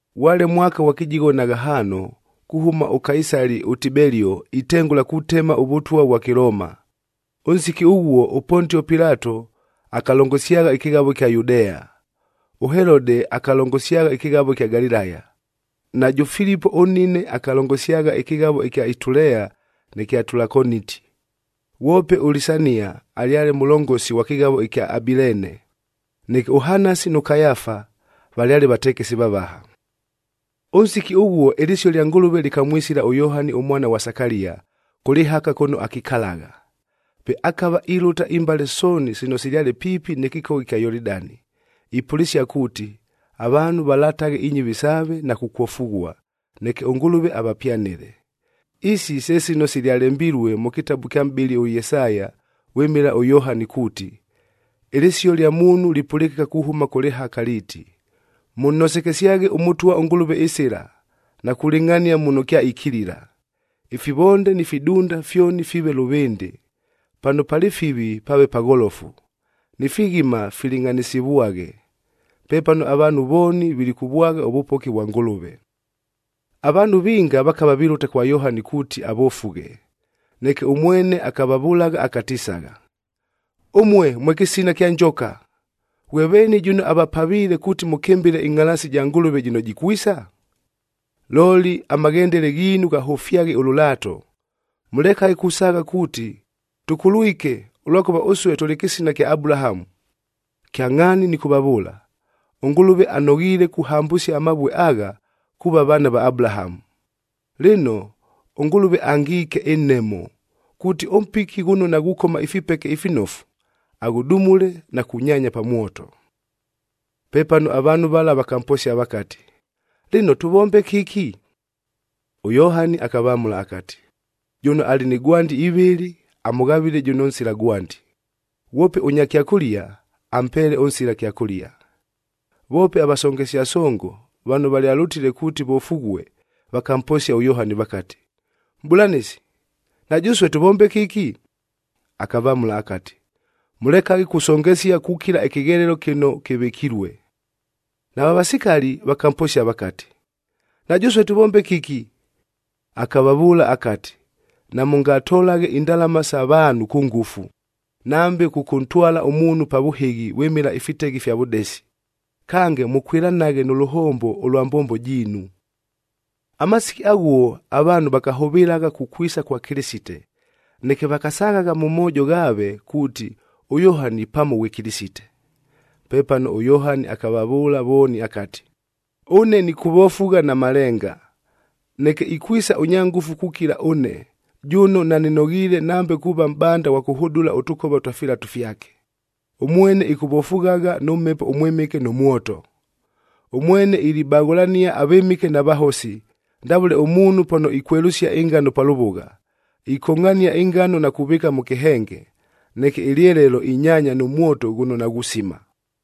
Ghwale mwaka ghwa kɨjigho na ghahaano, kuhʉma ʉKaisali ʉTibelio itengʉla kutema ʉvʉtwa ʉvwa Kɨlooma. Ʉnsiki ʉghuo ʉPontio Pilato akalongosyagha ɨkɨghavoa ɨkya Yudea, ʉHelodeb akalongosyagha ɨkɨghavo ɨkya Galilaya, najʉ Filipo ʉnnine akalongosyagha ɨkɨghavo ɨkya Itulea nɨ kya Tulakoniti, ghwope ʉLisania alyale mʉlongosi ghwa kɨghavo ɨkya Abileene. Neke ʉHanasi nʉ Kayafa valyale vatekesi vavaha.c Ʉnsiki ʉghuo ɨlɨsio lya Ngʉlʉve lɨkamwisila ʉYohani ʉmwana ghwa Sakalia, kʉ lɨhaka kʉno akikalagha. Pe akava ilʉta imbale sooni sino silyale piipi nɨ kɨkogha ɨkya Yolidani, ipʉlɨsia kuuti, avaanhu valataghe inyɨvi saave na kukwofughua, neke ʉNgʉlʉve avapyanɨle. Isi se sino silyalembilue mʉ kɨtabu kya mʼbɨli ʉYesaya vwɨmɨla ʉYohani kuuti, “Ɨlɨsio lya muunhu lipʉlɨkɨka kuhʉma kʉ lɨhaka liiti, ‘Mʉnnosekesyaghe ʉMʉtwa ʉNgʉlʉve ɨsɨla, na kulɨngʼhania muno kyaikilila. Ifivonde ni fidunda fyoni fiive lʉvɨndɨ, pano palɨ fivi pave pagholofu, ni fighima filɨngʼhanɨsɨvwaghe. Pepano avaanhu vooni vilikʉvwagha ʉvʉpoki vwa Ngʉlʉve.’d” Avaanhu vinga vakava vilʉta kwa Yohani kuuti avofughe, neke ʉmwene akavavʉlagha akatisagha, “Ʉmue mwe kɨsina kya njoka!e Ghwe veeni jʉno avapaviile kuuti mʉkɨmbɨle ɨngʼhalaasi ja Ngʉlʉve jɨno jikwisa? Looli, amaghendele ghiinu ghahʉfyaghe ʉlʉlaato. Mʉlekaghe kusaagha kuuti, ‘Tʉkulwike ʉlwakʉva ʉsue tʉlɨ kɨsina kya Abulahamu.’f Kyangʼhaani nɨkʉvavʉʉla, ʉNgʉlʉve anoghiile kuhambʉsia amavue agha, kuuva vaana va Abulahamu! Lɨno, ʉNgʉlʉve angiike ɨnhemo, kuuti ʉmpiki ghʉno naghukoma ifipeke ifinofu, aghʉdumule na kunyaanya pa mwoto.” Pepano avaanhu vala vakamposia vakati, “Lɨno tʉvombe kɨki?” ɄYohani akavamʉla akati, “Jʉno alɨ ni gwandi ivɨlɨ, amʉghavɨle jʉno nsila gwandi, ghwope ʉnya kyakʉlia, ampeele ʉnsila kyakʉlia.” Voope avasongesia songog vano valyalʉtile kuuti vofughue, vakamposia ʉYohani vakati, “Mʼbʉlanɨsi, na jʉsue tʉvombe kɨki?” Akavamʉla akati, “Mʉlekaghe kusongesia kukila ɨkɨghelelo kɨno kɨvɨkilue.” Nava vasikali vakamposia vakati, “Na jʉsue tʉvombe kɨki?” Akavavʉʉla akati, “Namʉngatolaghe indalama sa vaanhu kʉ ngʉfu, nambe kʉkʉntwala ʉmuunhu pa vʉhɨghi vwɨmɨla ifiteghe ifya vʉdesi. Kange, mʉkwɨlanaghe nʉ lʉhombo ʉlwa mbombo jiinu.” Amasiki aghuo avaanhu vakahʉvɨlagha kukwisa kwa Kɨlɨsite, neke vakasaghagha mʉ moojo ghaave kuuti, ʉYohani pamo ghwe Kɨlɨsite. Pepano ʉYohani akavavʉʉla vooni akati, “Ʉne nɨkʉvofugha na malenga, neke ikwisa ʉnya ngʉfu kukila ʉne, jʉno nanɨnoghiile nambe kuuva mʼbanda ghwa kʉhʉdʉla ʉtʉkova twa filatu fyake, ʉmwene ɨkʉvofughagha nʉ Mhepo ʉMwɨmɨke nʉ mwoto. Ʉmwene ilibaghʉlania avɨmɨke na vahosi, ndavʉle ʉmuunhu pano ikwelʉsia ɨngano pa lʉvʉgha, ikongʼhania ɨngano na kuvɨɨka mʉ kɨhenge, neke ɨlyelelo inyaanya nʉ mwoto ghʉno naghusima.”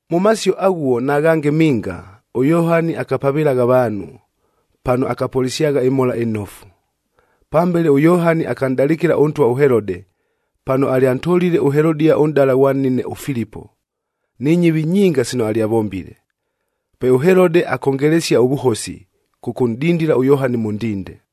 Mʉ masio aghuo na ghange minga, ʉYohani akapavɨlagha avaanhu, pano akapʉlɨsyagha ɨMhola ɨNofu. Pambele ʉYohani akanʼdalɨkɨla ʉntwa ʉHelode, pano alyantolile ʉHelodia ʉnʼdala ghwa nnine ʉFilipo, ni nyɨvi nyinga sino alyavombile. Pe ʉHelode akongelesia ʉvʉhosi, kʉkʉnʼdindila ʉYohani mʉ ndinde.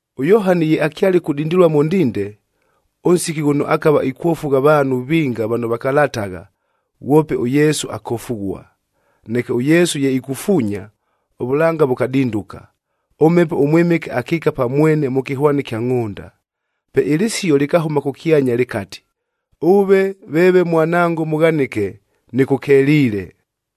ɄYohani ye akyale kudindilua mʉ ndinde, ʉnsiki ghʉno akava ikwofugha avaanhu vinga vano vakalatagha, ghwope ʉYesu akofughua. Neke ʉYesu ye ikufuunya, ʉvʉlanga vʉkadinduka, ʉMhepo ʉMwɨmɨke akiika pa mwene mʉ kɨhwani kya ngʼhʉnda. Pe ɨlɨsio lɨkahʉma kʉkyanya lɨkati, “Ʉve veeve Mwanango mʉghanɨke, nɨkʉkeliile.”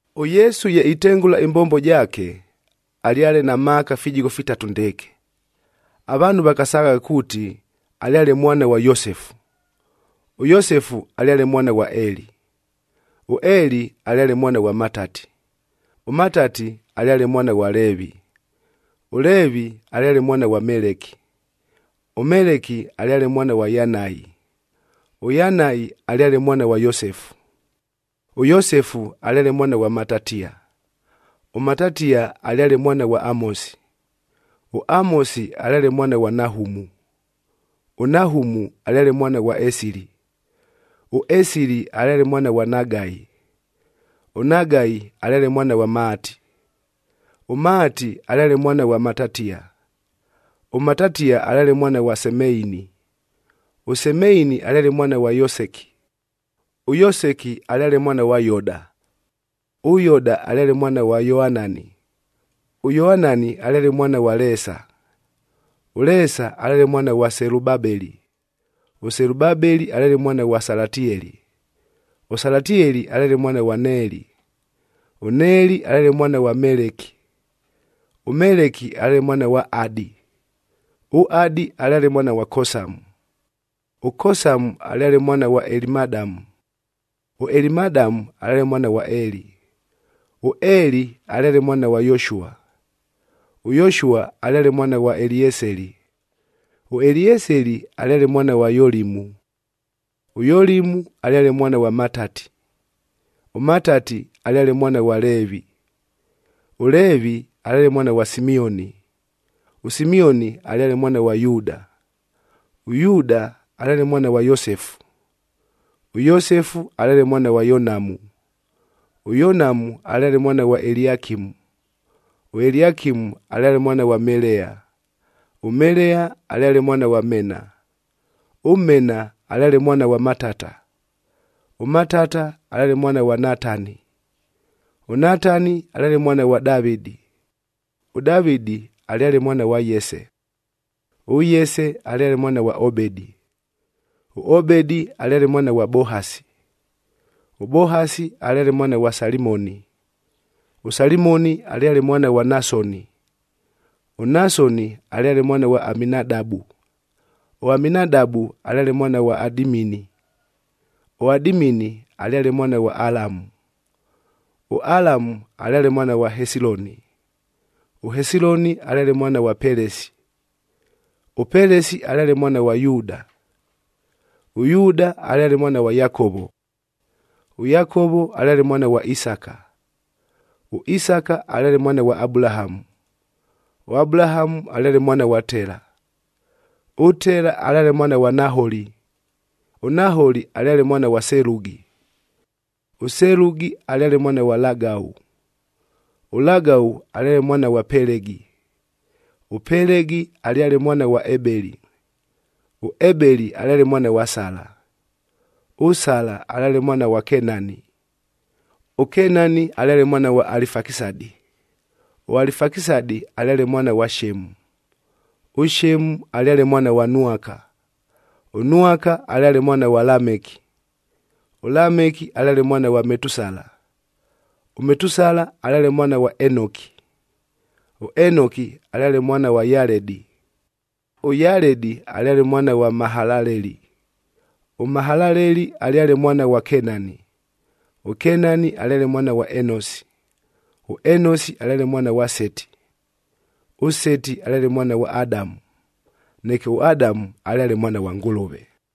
ɄYesu ye itengʉla ɨmbombo jaake, alyale na maaka fijigho fitatu ndɨɨkɨ. Avaanhu vakasaghagha kuuti alyale mwana ghwa Yosefu. ɄYosefu alyale mwana ghwa Eli. ɄEli alyale mwana ghwa Matati, ʉMatati alyale mwana ghwa Leevi, ʉLeevi alyale mwana ghwa Meleki, ʉMeleki alyale mwana ghwa Yanai, ʉYanai alyale mwana ghwa Yosefu. ɄYosefu alyale mwana ghwa Matatia, ʉMatatia alyale mwana ghwa Amosi, ʉAmosi alyale mwana ghwa Nahumu, ʉNahumu alyale mwana ghwa Esili, ʉEsili alyale mwana ghwa Nagai. ɄNagai alyale mwana ghwa Maati, ʉMaati alyale mwana ghwa Matatia, ʉMatatia alyale mwana ghwa Semeini, ʉSemeini alyale mwana ghwa Yoseki, ʉYoseki alyale mwana ghwa Yoda. ɄYoda alyale mwana ghwa Yoanani, ʉYoanani alyale mwana ghwa Leesa, ʉLeesa alyale mwana ghwa Selubabeli, ʉSelubabeli alyale mwana ghwa Salatieli, ʉSalatieli alyale mwana ghwa Neeli. ɄNeeli alyale mwana ghwa Meleki, ʉMeleki alyale mwana ghwa Adi, ʉAdi alyale mwana ghwa Kosamu, ʉKosamu alyale mwana ghwa Elimadamu, ʉElimadamu alyale mwana ghwa Eli. ɄEli alyale mwana ghwa Yoshua, ʉYoshua alyale mwana ghwa Elieseli, ʉElieseli alyale mwana ghwa Yolimu, ʉYolimu alyale mwana ghwa Matati, ʉMatati alyale mwana ghwa Leevi. ɄLeevi alyale mwana ghwa Simioni, ʉSimioni alyale mwana ghwa Yuuda, ʉYuuda alyale mwana ghwa Yosefu, ʉYosefu alyale mwana ghwa Yonamu, ʉYonamu alyale mwana ghwa Eliakimu. ɄEliakimu alyale mwana ghwa Melea, ʉMelea alyale mwana ghwa Mena, ʉMena alyale mwana ghwa Matata, ʉMatata alyale mwana ghwa Natani, ʉNatani alyale mwana ghwa Davɨdi. ɄDavɨdi alyale mwana ghwa Yese, ʉYese alyale mwana ghwa Obedi, ʉObedi alyale mwana ghwa Bohasi, ʉBohasi alyale mwana ghwa Salimoni, ʉSalimoni alyale mwana ghwa Nasoni. ɄNasoni alyale mwana ghwa Aminadabu, ʉAminadabu alyale mwana ghwa Adimini, ʉAdimini alyale mwana ghwa Alamu.h ɄAlamu alyale mwana ghwa Hesiloni, ʉHesiloni alyale mwana ghwa Pelesi, ʉPelesi alyale mwana ghwa Yuuda. ɄYuuda alyale mwana ghwa Yakovo, ʉYakovo alyale mwana ghwa Isaka, ʉIsaka alyale mwana ghwa Abulahamu, ʉAbulahamu alyale mwana ghwa Tela, ʉTela alyale mwana ghwa Naholi. ɄNaholi alyale mwana ghwa Selugi, ʉSelugi alyale mwana ghwa Lagau, ʉLagau alyale mwana ghwa Pelegi, ʉPelegi alyale mwana ghwa Ebeli, ʉEbeli alyale mwana ghwa Sala. ɄSala alyale mwana ghwa Kenani, ʉKenani alyale mwana ghwa Alifakisadi, ʉAlifakisadi alyale mwana ghwa Shemu, ʉShemu alyale mwana ghwa Nwaka, ʉNwaka alyale mwana ghwa Lameki. ɄLameki alyale mwana ghwa Metusala, ʉMetusala alyale mwana ghwa Enoki, ʉEnoki alyale mwana ghwa Yaledi, ʉYaledi alyale mwana ghwa Mahalaleli, ʉMahalaleli alyale mwana ghwa Kenani. ɄKenani alyale mwana ghwa Enosi, ʉEnosi alyale mwana ghwa Seti, ʉSeti alyale mwana ghwa Adamu. Neke ʉAdamu alyale mwana ghwa Ngʉlʉve.